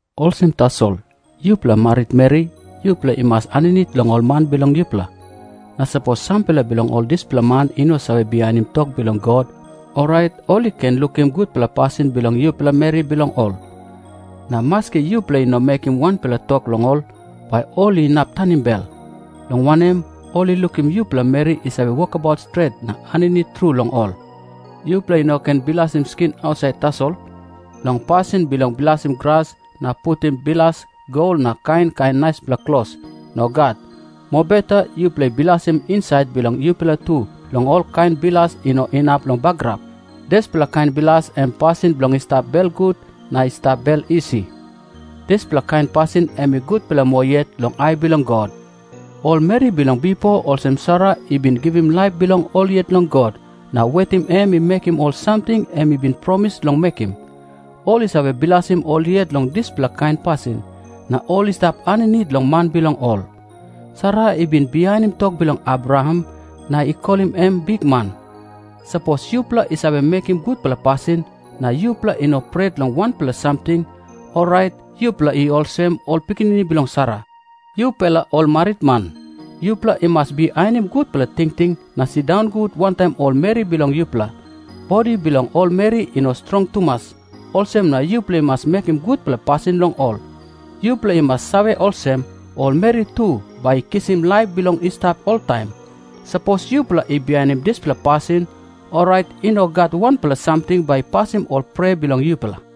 Olsem tasol, yupela maritmeri, yupela i mas aninit long ol man bilong yupela. Na sapos sampela bilong ol dispela man i no save bihainim tok bilong God, orait ol i ken lukim gutpela pasin bilong yupela meri bilong ol. Na maski yupela i no mekim wanpela tok long ol, bai ol i inap tanim bel, long wanem, ol i lukim yupela meri i save wokabaut stret na aninit tru long ol. Yupela i no ken bilasim skin ausait tasol, long pasin bilong bilasim gras na putim bilas gol na kain kain naispela klos. Nogat. Mobeta yupela i bilasim insait bilong yupela tu long olkain bilas i no inap long bagarap. Dispela kain bilas em pasin bilong i stap belgut na i stap bel isi. Dispela kain pasin em i gutpela moa yet long ai bilong God. Ol meri bilong bipo olsem Sara i bin givim laip bilong ol yet long God na wetim em i mekim ol samting em i bin promis long mekim, ol i save bilasim ol yet long dispela kain pasin, na ol i stap aninit long man bilong ol. Sara i bin bihainim tok bilong Abraham na i kolim em “bikman”. Sapos yupela i save mekim gutpela pasin, na yupela i no pret long wanpela samting, orait yupela i olsem ol pikinini bilong Sara. Yupela ol maritman, yupela i mas bihainim gutpela tingting na sindaun gut wantaim ol meri bilong yupela. Bodi bilong ol meri i no strong tumas, olsem na yupela i mas mekim gutpela pasin long ol. Yupela i mas save olsem, ol meri tu bai i kisim laip bilong i stap oltaim. Sapos yupela i bihainim dispela pasin, orait i no gat wanpela samting bai i pasim ol prea bilong yupela.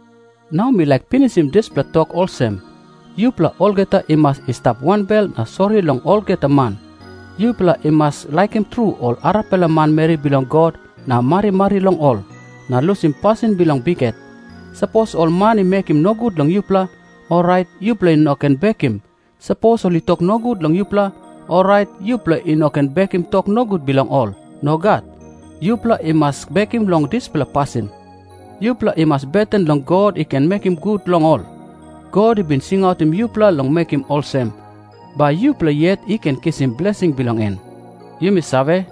Nau mi laik pinisim dispela tok olsem, yupela olgeta i mas i stap wanbel na sori long olgeta man. Yupela i mas laikim tru ol arapela manmeri bilong God na marimari long ol, na lusim pasin bilong bikhet. Sapos ol man i mekim nogut long yupela, orait yupela i no ken bekim. Sapos ol i tok nogut long yupela, orait yupela i no ken bekim tok nogut bilong ol. Nogat. Yupela i mas bekim long dispela pasin. Yupela i mas beten long God i ken mekim gut long ol. God i bin singautim yupela long mekim olsem, bai yupela yet i ken kisim blesing bilong en. Yumi save,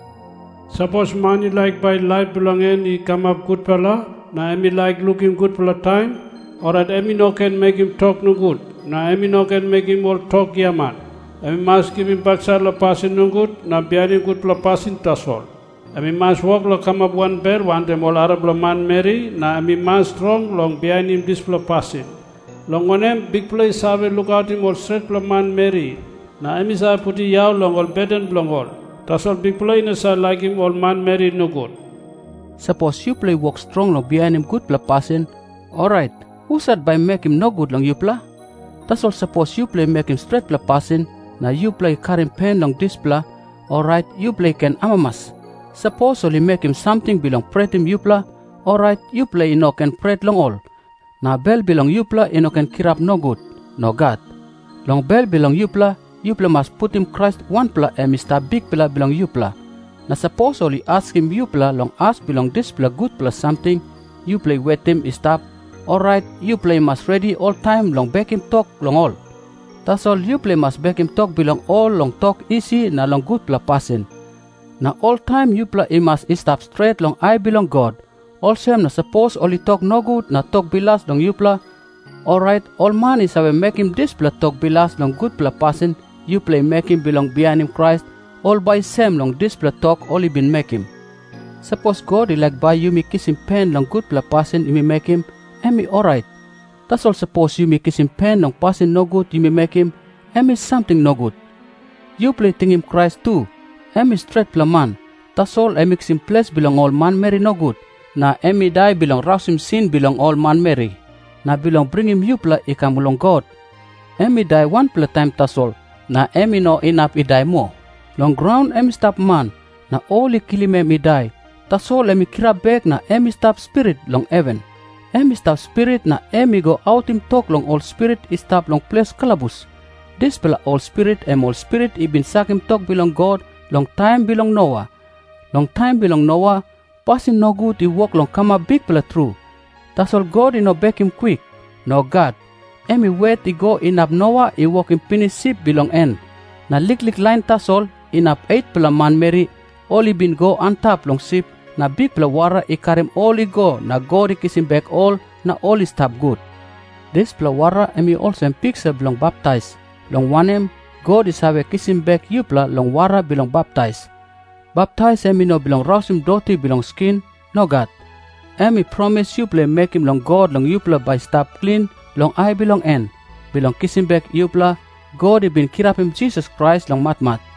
“Sapos man i laik bai laip bilong en i kamap gutpela, na em i laik lukim gutpela taim, orait em i no ken mekim tok nogut na em i no ken mekim ol tok giaman. Em i mas givim baksait long pasin nogut, na bihainim gutpela pasin tasol. Em i mas wok long kamap wanbel wantaim ol arapela manmeri, na em i mas strong long bihainim dispela pasin. Long wanem, Bikpela i save lukautim ol stretpela manmeri, na em i save putim yau long ol beten bilong ol. Tasol Bikpela i no save laikim ol manmeri nogut.” Sapos yupela i wok strong long bihainim gutpela pasin, orait husat bai i mekim nogut long yupela? Tasol sapos yupela i mekim stretpela pasin, na yupela i karim pen long dispela, orait yupela i ken amamas. Sapos ol i mekim samting bilong pretim yupela, orait yupela i no ken pret long ol. Na bel bilong yupela i no ken kirap nogut. Nogat. Long bel bilong yupela, yupela i mas putim Krais wanpela em i stap Bikpela bilong yupela. Na sapos ol i askim yupela long as bilong dispela gutpela samting yupela i wetim i stap, orait yupela i mas redi oltaim long bekim tok long ol. Tasol yupela i mas bekim tok bilong ol long tok isi na long gutpela pasin. Na oltaim yupela i mas i stap stret long ai bilong God. Olsem na sapos ol i tok nogut na tok bilas long yupela, orait ol man i save mekim dispela tok bilas long gutpela pasin yupela i mekim bilong bihainim Krais, ol bai i sem long dispela tok ol i bin mekim. Sapos God i laik bai yumi i kisim pen long gutpela pasin yumi mekim, em i orait. Tasol sapos yumi kisim pen long pasin nogut yumi mekim, em i samting nogut. Yupela tingim Krais tu. Em i stretpela man, tasol em i kisim ples bilong ol manmeri nogut, na em i dai bilong rausim sin bilong ol manmeri, na bilong bringim yupela i kam long God. Em i dai wanpela taim tasol, na em i no inap i dai moa. Long graun em i stap man, na ol i kilim em i dai, tasol em i kirap bek na em i stap spirit long heven. Em i stap spirit na em i go autim tok long ol spirit i stap long ples kalabus. Dispela ol spirit em ol spirit i bin sakim tok bilong God long taim bilong Noa. Long taim bilong Noa, pasin nogut i wok long kamap bikpela tru, tasol God i no bekim kwik. Nogat. Em i wet i go inap Noa i wokim pinis sip bilong en. Na liklik lain tasol, inap 8-pela manmeri, ol i bin i go antap long sip na bikpela wara i karim ol i go na God i kisim bek ol na ol i stap gut. Dispela wara em i olsem piksa bilong baptais, long wanem, God i save kisim bek yupela long wara bilong baptais. Baptais em i no bilong rausim doti bilong skin. Nogat. Em i promis yupela i mekim long God long yupela bai i stap klin long ai bilong en. Bilong kisim bek yupela, God i bin kirapim Jisas Krais long matmat,